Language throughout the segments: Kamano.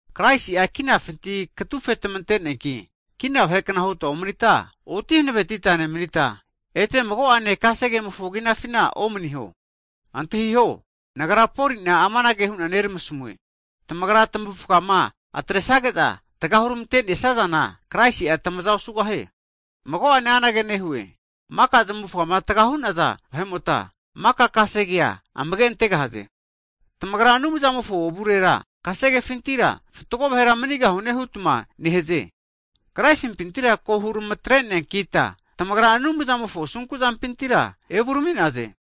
Kraisi'a kinafinti katufe tamente'neanki kina vahekna huta omnita, oti hanavetita nemnita, ete mago'ane kasegemofo kinafina omaniho. Antahiho, Nagra Poli'na amanage hu'na neramasamue, tamagra tamavufgama atresage'za tga hurmante'nesazana, Kraisi'a tamaza osugahie. Mago'ane anage nehue, maka zmufama taga hu'naza vahe'mota, maka kasegea amage'antegahaze. Tamagra Anumzamofo avurera kasegefintira fatgo vahera manigahune hutma nehaze. Kraisimpintira ko huramatre'neankita, tamagra Anumzamofo asunku'zampintira evurami'naze.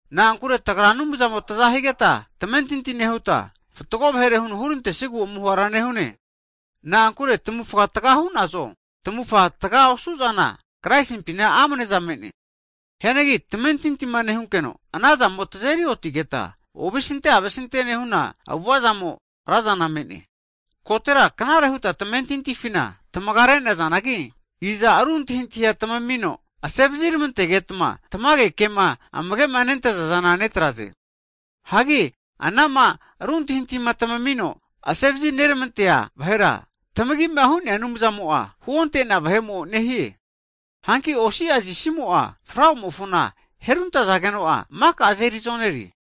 Na'ankure tagra Avamumo taza higeta tamentinti nehuta, fatgo vahere huno hurantesigu amuhara nehune. Na'ankure tamavufa tga hu'nazo, tamavufa tga osunaza zana Kraisimpina amneza me'ne. Hianagi tamentinti nehunkeno anazamo tazeri otigeta, ovesinte avesinte nehuna avu'avazamo razana me'ne. Kotera knare huta tamentintifina tamaga re'nazanagi, iza ru antahintahi tamamino asevazirmantegetma tamage kema amage'ma nentazazana netraze? Hagi anama ru antahintahi tamamino asevazinermante'nea vahera, tamagima hu'nea Anumzamo'a huonte'nea vahe'mo nehie. Hanki osi'a zisimo'a, flauamofona heruntazageno'a maka azeri zonere.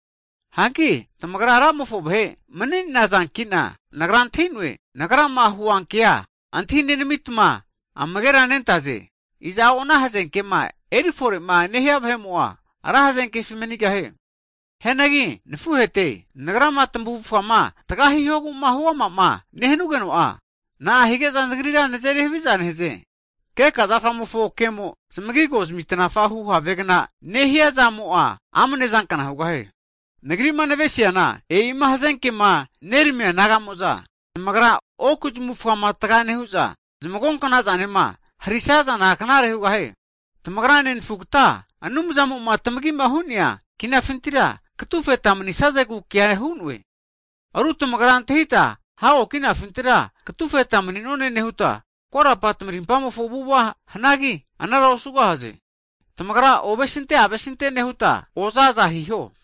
Hanki tamagra Ramofo vahe mni'nazankina, nagra antahi'noe. Nagrama huankea antahinenamitma amagera nentaze. Iza'o ana hazekema erifore'ma nehia vahe'mo'a ra hazenkefi manigahie. Hianagi nafuhete, nagrama tamavufgama tga hihogu'ma huamama nehanugeno'a, na'a hige'za nagrira nazeri haviza nehaze? Keka zafamofo kemo'a zmagigo zamitnafa hu havegna nehiazamo'a amanezankna hugahie. Nagri'ma navesiana e'ima hazenkema neramia nagamo'za, zamagra oku zamavufgama tga nehu'za, zmagonknazama harisazana knare hugahie. Tamagra nenafugata Anumzamo'ma tamagima hu'neana kinafintira katufeta manisazegegu kea hu'ne. Ru tamagra antahita hago kinafintira katufeta mni'none nehuta, korapa tamarimpamofo avu'ava hanagi, anara osugahaze. Tamagra ovesinte avesinte hu avu'ava zampinti oza aza hiho.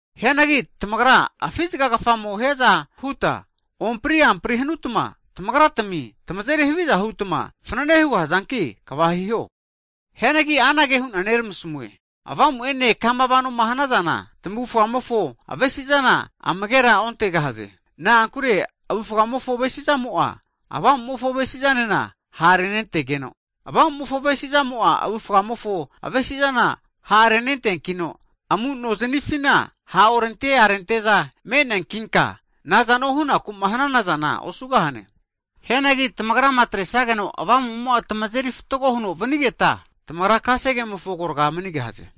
Hianagi tamagra afi zgakafamo hiaza huta, ompri ampri hanutma tamagratami tamazeri haviza hutma fnanene hugahazanki kva hiho. Hianagi anage hu'na neramasamue, Avamu'ene kama vanoma hanazana, tamavufgamofo avesi'zana amagera ontegahaze. Na'ankure avufgamofo avesizamo'a, Avamumofo avesizanena ha'rentegeno, Avamumofo avesi'zamo'a avufgamofo avesi'zana ha'renenteankino, amu'nozanifina ha' orente arente'za me'neankinka, nazano hunaku'ma hanana zana osugahane. Hianagi tamagrama atresageno Avamumo'ma tamazeri fatgo huno vanigeta, tamagra kasegemofo agorga omanigahaze.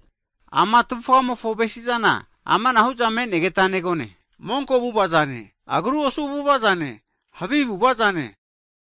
Ama tavufgamofo avesi'zana amanahu'za me'negeta negone. Monko avu'avazane, agru osu avu'avazane, havi avu'avazane,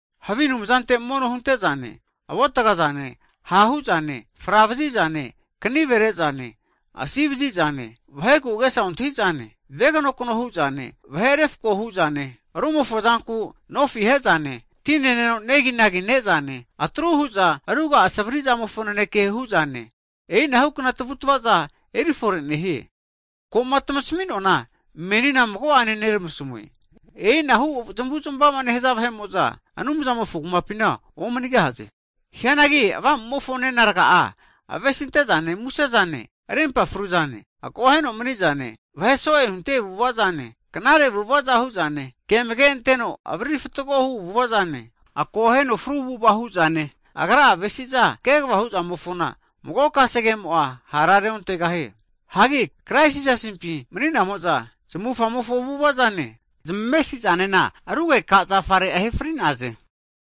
havi anumzante mono huntezane, avotga zane, ha' hu'zane, fravazi'zane, knive re'zane, asi vazi'zane, vaheku agesa ontahi zane, veganokno hu'zane, vahe refko hu'zane, rumofo zanku nofi ahe'zane, ti neneno negi ne'zane, atru hu'za ruga'a savri' zamofo naneke hu'zane. E'inahukna tavutavazana eri fore nehie. Ko'ma tamasmi'noana meni mago'ene neramasmue. E'inahu zamavu'zmavama nehaza vahe'mo'za Anumzamofo kumapi omanigahaze. Hianagi Avamumofo avu'avazana avesinte'zane muse'zane, rimpa fru'zane, akoheno mni'zane, vahe so'e hunte avu'ava zane, knare avu'ava hu'zane, ke amage'anteno avariri fatgohu avu'avazane, akoheno fru avu'ava hu'zane, agra'a avesiza kegva huzamofona mago kasegemo'a hara reontegahie. Hagi Krais Jisasimpi mani'namo'za, zamufamofo avu'avazane, zmesi'zanena rugeka zafare ahe fri'naze.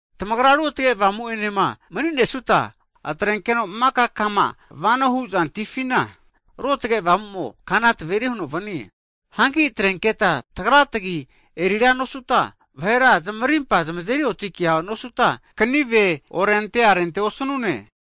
Tagrama Ruotge Avamu'enema maninesuta, atrenunkeno maka kama vano huzantifina Ruotge Avamumo kana taveri huno vanie. Hanki atrenketa tagra tagi erira nosuta, vahera zmarimpa zmazeri otikea nosuta, kanive orente arente osanune.